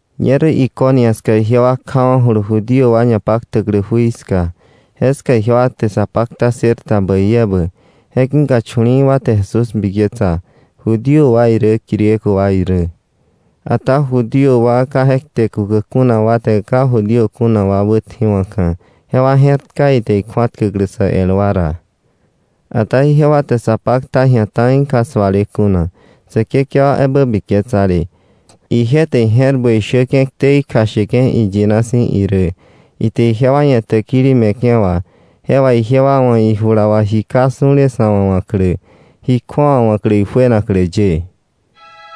Ñerä Iconio ska ijewa kjawa̱julu Judío wa ñapaktäklä jui ska. Jeska ijewa te sa pakta ssër ta bäi ebä, je ki̱ka chu̱li̱i̱ wa te Jesús biketsa, Judío wa irä Griego wa irä. Ata Judío wa ka je kte kukäk kuna wa te ka Judío kuna wa wätji̱wa̱ka̱, jewa je̱rtka ite ikju̱atkäklä sä el wa ra. Ata ijewa te sa pakta ji̱a ta̱i ka suale kuna, Säkekewa ebä biketsale. Ije te ije̱r bäi shäke̱ ktei kjasheke̱ iyina si̱ irä, ite ijewa ia̱ täkili me̱ke̱ wà, je wà ijewa wa̱ ijula wà ji ka su̱le sa̱ wa̱ wa̱klä, ji kju̱awa wa̱klä ijuenaklä ye.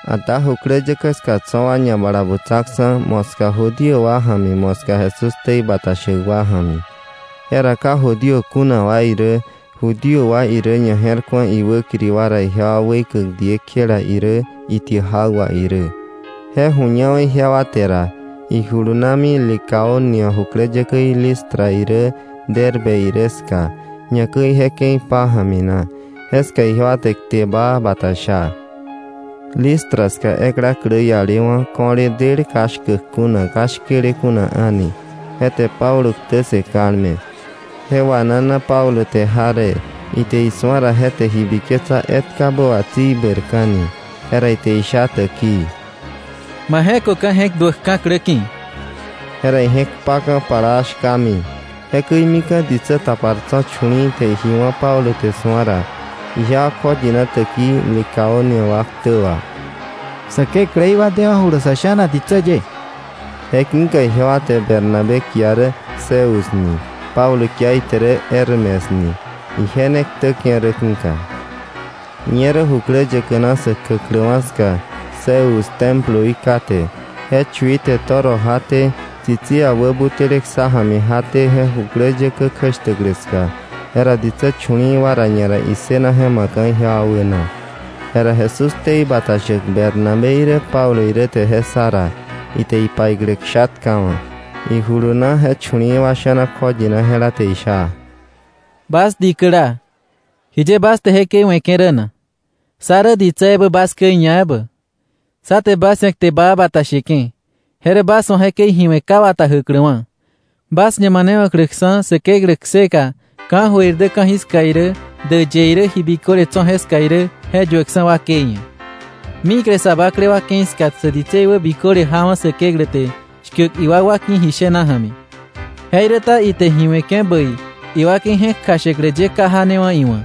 Ata jukläyäkä ska tso̱ wa ñabalabutsaksa̱, moska Judío wa ja̱mi, moska Jesús ktei bata shäk wa ja̱mi. Jera ka Judío kuna wa irä Judío wa irä ñaje̱rku̱a iwäkiri wa ra ijewa weikäk diekjela irä, itiäk jak wà irä. Je ju̱ñawa̱ ijewa te ra, ijulunami Licaonia jukläyäkäí Listra irä Derbe irä ska, ñakäi je ke̱i pája̱mi na. Jeska ijewa te kte baa bata sha. Listra ska ekla klä ialewa̱, ko̱le del ka shkäk kuna, ka shkele kuna a̱ni, je te Pablo ktä ssë kalme. Je wanana Pablo te jaree, ite isu̱a ra je te ji biketsa etkabä wà tsi ibäirka̱ni. Jera ite isha täkii: —Ma je̱köka̱ je̱k duäkka̱ klä ki̱. Jera ije̱k kpaka̱ plaa shkami. Jekäi mika̱ ditsä tapar tso̱ chu̱li̱i̱ te ji wá̱ Pablo te su̱a ra, ijewa kjoyina täkii Licaonia wa ktä wà: —¡Sä kekläí wa dewa̱julu sa̱ sha̱na ditsä ye! Je ki̱ka ijewa te Bernabé kia rä Zeus ni, Pablo kia ite rä Hermes ni, ije ne ktäke̱ rä ki̱ka. Ñerä jukläyäkä na sä kjäkläwa̱ ska Zeus temploí kate, je chui te toro jaté, tsitsia wä butäle ksá ja̱mi jaté je jukläyäkä kjäshtäklä ska. Jera ditsä chu̱li̱i̱ wa ra ñara issëna je ma̱kka̱ ijewa wäna. Jera Jesús ktei bata shäk Bernabé irä Pablo irä te je ssa ra, ite ipaiklä ksha tkawa̱, ijuluna je chu̱li̱i̱ wa sha̱na kjoyina jela te isha: —Bas dikäla, ¿jiye bas te jekäi we̱ke̱ rä na? Sá rä ditsä ebä bas käi ñaebä. Sá te bas ia̱ kte baa bata sheke̱, je rä bas wa̱ jekäi ji we̱ ka wata jäkläwa̱, bas ñamanewa̱kläksa̱ Säkeklä kseka ka̱jöir irä ka̱jiska irä, däyë irä, ji biköle tso̱ jeska irä je yuäkksa̱ wakei ia̱. Mikle sa bakle wa ke̱i ska sä ditsei wä biköle jawa̱ Säkeklä te shkäk iwakwa ki̱ ji shena ja̱mi. Jeiräta ite ji we̱ke̱ bäi iwakei je̱k kjashäklä ye ka janewa̱ iwa̱,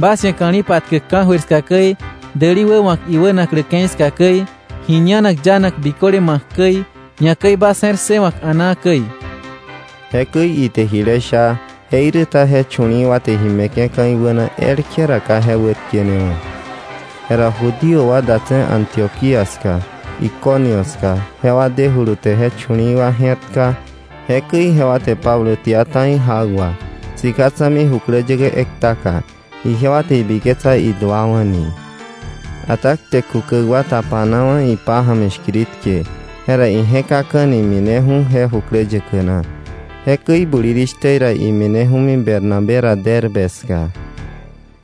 bas ia̱ ka̱li̱ patkäk ka̱jöir ska käi, däli wäwa̱k iwänaklä ke̱i ska käi, ji ñanak yanak biköle ma̱k käi, ñakäi bas je̱r ssëwa̱k a̱naa käi. Jekäi ite jile sha, jeiräta je chu̱li̱i̱ wa te ji me̱ke̱ka̱ iwäna elkje ra ka je wätkenewa̱. Jera Judío wa datse̱ Antioquía ska Iconio ska jewa dejulu te je chu̱li̱i̱ wa je̱rtka, jekäi jewa te Pablo tia ta̱i jak wà, sika tsa̱mi jukläyäkä ektaka, ijewa te ibiketsa iduawa̱ ni. Ata kte kukäk wa ñatapawa̱ ipája̱mi shkiritke, jera ije̱kaka̱ni mineju̱ni je jukläyäkä na. Jekäi bulirishtä ra imineju̱mi Bernabé ra Derbe ska.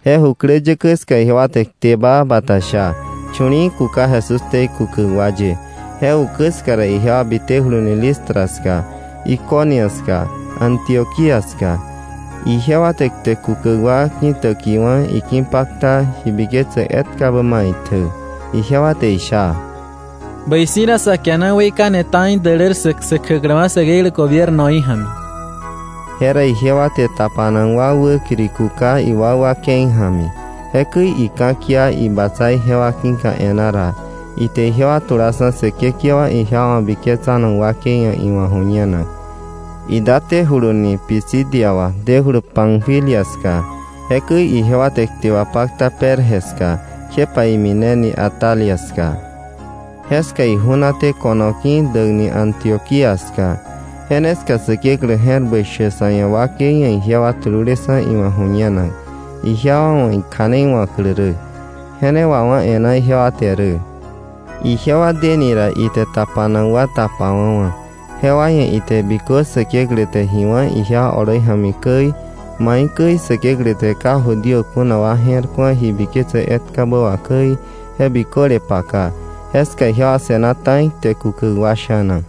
Je jukläyäkä ska ijewa te kte baa bata sha, chu̱li̱i̱ kuka Jesús ktei kukäk wa ye, je ukä ska ra, ijewa bitejuluni Listra ska, Iconio ska, Antioquía ska, ijewa te kte kukäk wa ki̱täkiwa̱, iki̱pakta ji biketsäk etkabä maitjä. Ijewa te isha: —Bäi si̱ ra sa kiana weikane ta̱i dälär ssäk, sä kjäkläwa̱ Säkeklä gobiernoí ja̱mi. Jera ijewa te tapanak wa wäkiri kuka iwakwa ke̱i ja̱mi. Jekäi ika̱kia ibatsa ijewa ki̱ka e̱ná ra, ite ijewa tulaksa̱ Säkekewa ijewa wa̱ biketsanak wakei ia̱ iwa̱ ju̱ñenak. Idatéjuluni Pisidia wà dejulu Panfilia ska. Jekäi ijewa te kte wapakta Perge ska, kjepa imineni Atalia ska. Jeska iju̱naté ko̱no ki̱ däkni Antioquía ska. Je ne ska Säkeklä je̱r bäi shäk sa̱ ia̱ wakei ia̱ ijewa tululeksa̱ iwa̱ ju̱ñenak, ijewa wa̱ ikja̱nei wa̱klä rä. Je ne wawá̱ e̱ná ijewa te rä. Ijewa dene ra ite tapanak wa tapawa̱wa̱. Jewa ia̱ ite bikö Säkeklä te ji wá̱ ijewa oloi ja̱mi käi, maikäi Säkeklä te ka Judío kuna wa je̱r ku̱a ji biketse etkabä wà käi, je biköle paka. Jeska ijewa se̱na ta̱i kte kukäk wa sha̱na.